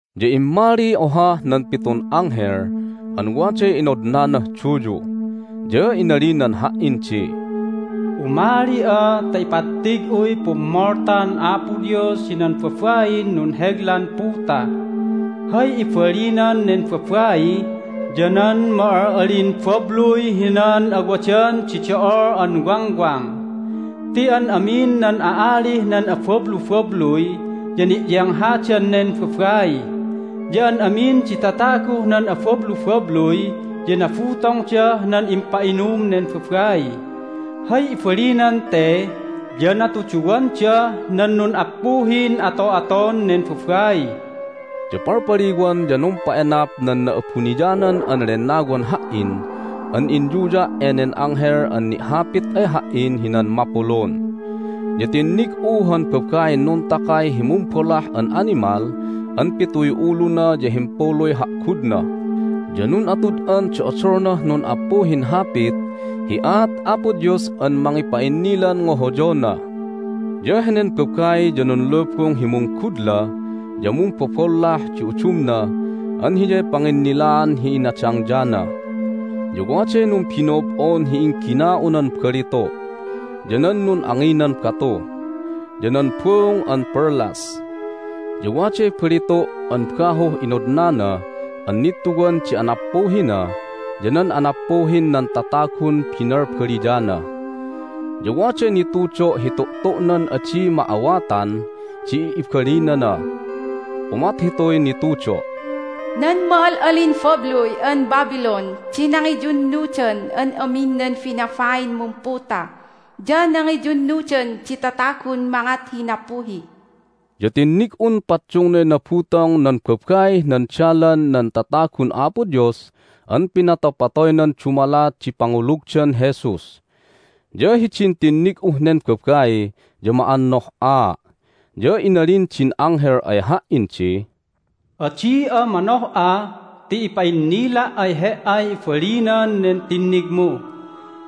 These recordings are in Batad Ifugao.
Ya immaliy ohah nan pitun anghel an waday inodnanah duyu, ya inalinan ha"in di, "Umali'a ta ipattig'uy pummoltan Apo Dios hinan babain nunheglan puta. Hay ibalinan nen babai ya nan ma'al'alin babluy hinan awadan di do'ol an wangwang. Ti an amin nan a'alih nan abablubabluy ya ni'yenghadan nen babai. Ya an amin di tataguh nan abablubabluy ya nabutongdah nan impa'inum nen babai. Hay ibalinan te ya natuduwandah nan nun'appuhin ato'aton nen babai." Ya palpaliwan ya numpa'enap nan Na'abuniyanan an Lennawan ha"in an inyuya' enen anghel an ni'hapit ay ha"in hinan mapulun. Ya tinnig'u han babain nuntakay hi mumbolah an animal an pituy uluna ya himpuluy ha'gudna, ya nun'atud'an di odolnah nun'appuhin hapit hi aat Apo Dios an mangipa'innilan ngohoyona. Ya henen babai ya nunlubung hi munggudla ya mumbobollah di udumna an hiyay panginnilaan hi inadangyana. Ya waday numbino'ob'on hi inggina'unan balitu', ya nan nun'anginan batu, ya nan buung an perlas. Ya waday balitu' an bahuh inodnana an nittuwan di anappuhina ya nan anappuhin nan tatagun binalbaliyana. Ya waday nitudo' hi tu'tu'nan adi ma'awatan di ibalinana. Umat hituy nitudo': "Nan ma'al'alin babluy an Babylon di nangiyunnudan an amin nan binabain mumputa, ya nangiyunnudan di tatagun mangat hi nappuhi." Ya tinnig'un paddungnay nabutong nan babaih nan dalan nan tatagun Apo Dios an pinatopatoynan dumalat di pangulugdan Jesus. Ya hidin tinnig'uh nen babai ya ma'annoh'aa'. Ya inalin din anghel ay ha"in di, "Adi'a manoh'a ti ipa'innila' ay he"ay ibalinan nen tinnigmu.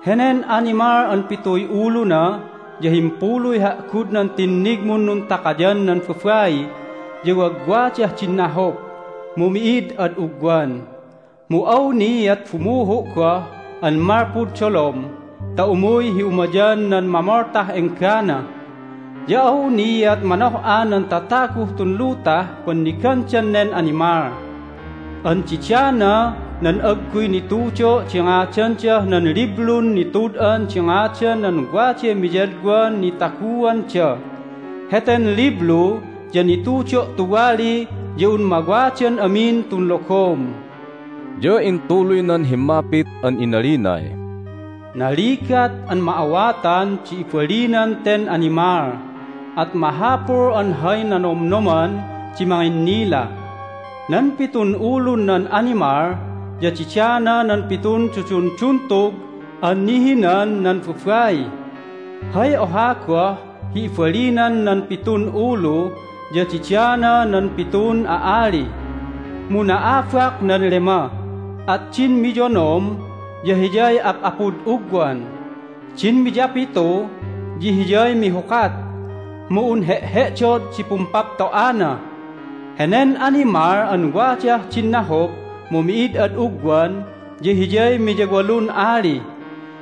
Henen animal an pituy uluna ya himpuluy ha'gudnan tinnigmun nuntakayan nan babai ya wagwadah din nahup, mu mi'id ad ugwan. Mu awniat bumuhu' goh an malpud dolom ta umuy hi umayan nan mamoltah enggana. Ya awniat manoh'a nan tataguh tun lutah pannigandan nen animal. An didana nan agguy nitudo' di ngadandah nan Liblun Nitud'an di Ngadan nan Waday Miyadwan Nitaguanda. Heten liblu ya nitudo' tuwali ya un mawadan amin tun logom." Ya intuluynan himmapit an inalinay, "Naligat an ma'awatan di ibalinan ten animal! At mahapul an hay nanomnoman di manginnila. Nan pitun ulun nan animal ya didana nan pitun dudunduntug an nihinan nan babai. Hay oha goh hi ibalinan nan pitun ulu ya didana nan pitun a'ali. Mu na'abak nan lema, at din miyonom ya hiyay ap'apud ugwan. Din miyapitu ya hiyay mihukat, mu un he'he'dod di pumpapto'ana. Henen animal an wadah din nahup mu mi'id ad ugwan ya hiyay miyawalun ali.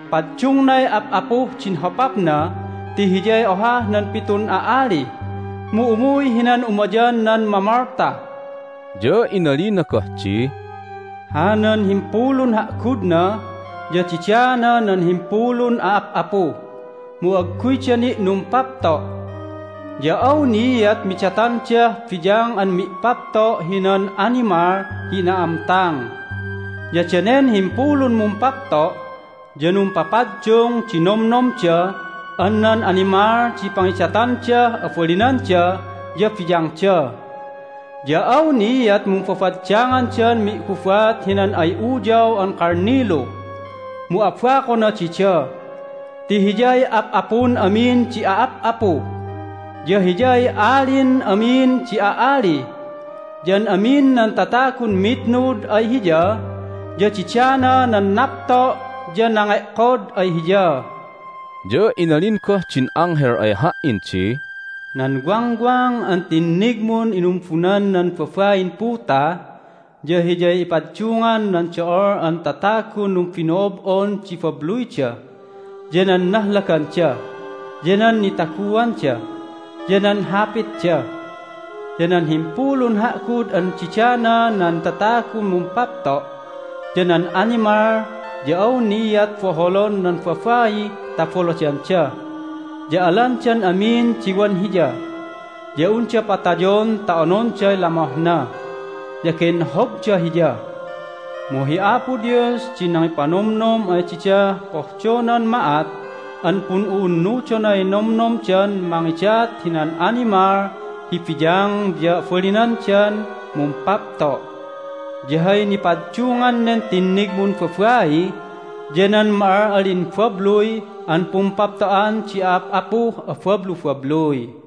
Paddungnay ap'apuh din hopapna ti hiyay ohah nan pitun a'ali, mu umuy hinan umayan nan mamolta." Ya inalina goh di, "Hanan himpulun ha'gudna ya didana nan himpulun a'ap'apu, mu agguyda ni' numpapto'. Ya awniat midatandah biyang an mi'papto' hinan animal hi na'amtang. Ya danen himpulun mumpapto' ya numpapaddung di nomnomda an nan animal di pangidatandah abalinanda ya biyangda. Ya awniat mumbabaddangandan mi'gubat hinan ay Uyaw an Kalnilu, mu abakona dida ti Hiyay Ap'apun amin di a'ap'apu, ya Hiyay Alin amin di a'ali. Ya an amin nan tatagun mitnud ay Hiya ya didana nan napto' ya nange'kod ay Hiya." Ya inalin goh din anghel ay ha"in di, "Nan wangwang an tinnigmun inumbunan nan babain puta ya hiyay ipaddungan nan do'ol an tatagun numbino'ob'on di babluyda, ya nan nahlaganda, ya nan nitaguanda, ya nan hapitda. Ya nan himpulun ha'gud an didana nan tatagun mumpapto', ya nan animal ya awniat boholon nan babai ta boladanda, ya alandan amin di wan hiya. Ya unda patayon ta ononday lamohna, ya genhobda hiya. Mu hi Apo Dios di nangipanomnom ay didah pohdonan ma'at an pun'u'unnudonay nomnomdan mangidat hinan animal hi biyang ya abalinandan mumpapto'. Ya hay nipaddungan nen tinnigmun babai ya nan ma'al'alin babluy an pumpapto'an di a'ap'apuh abablubabluy."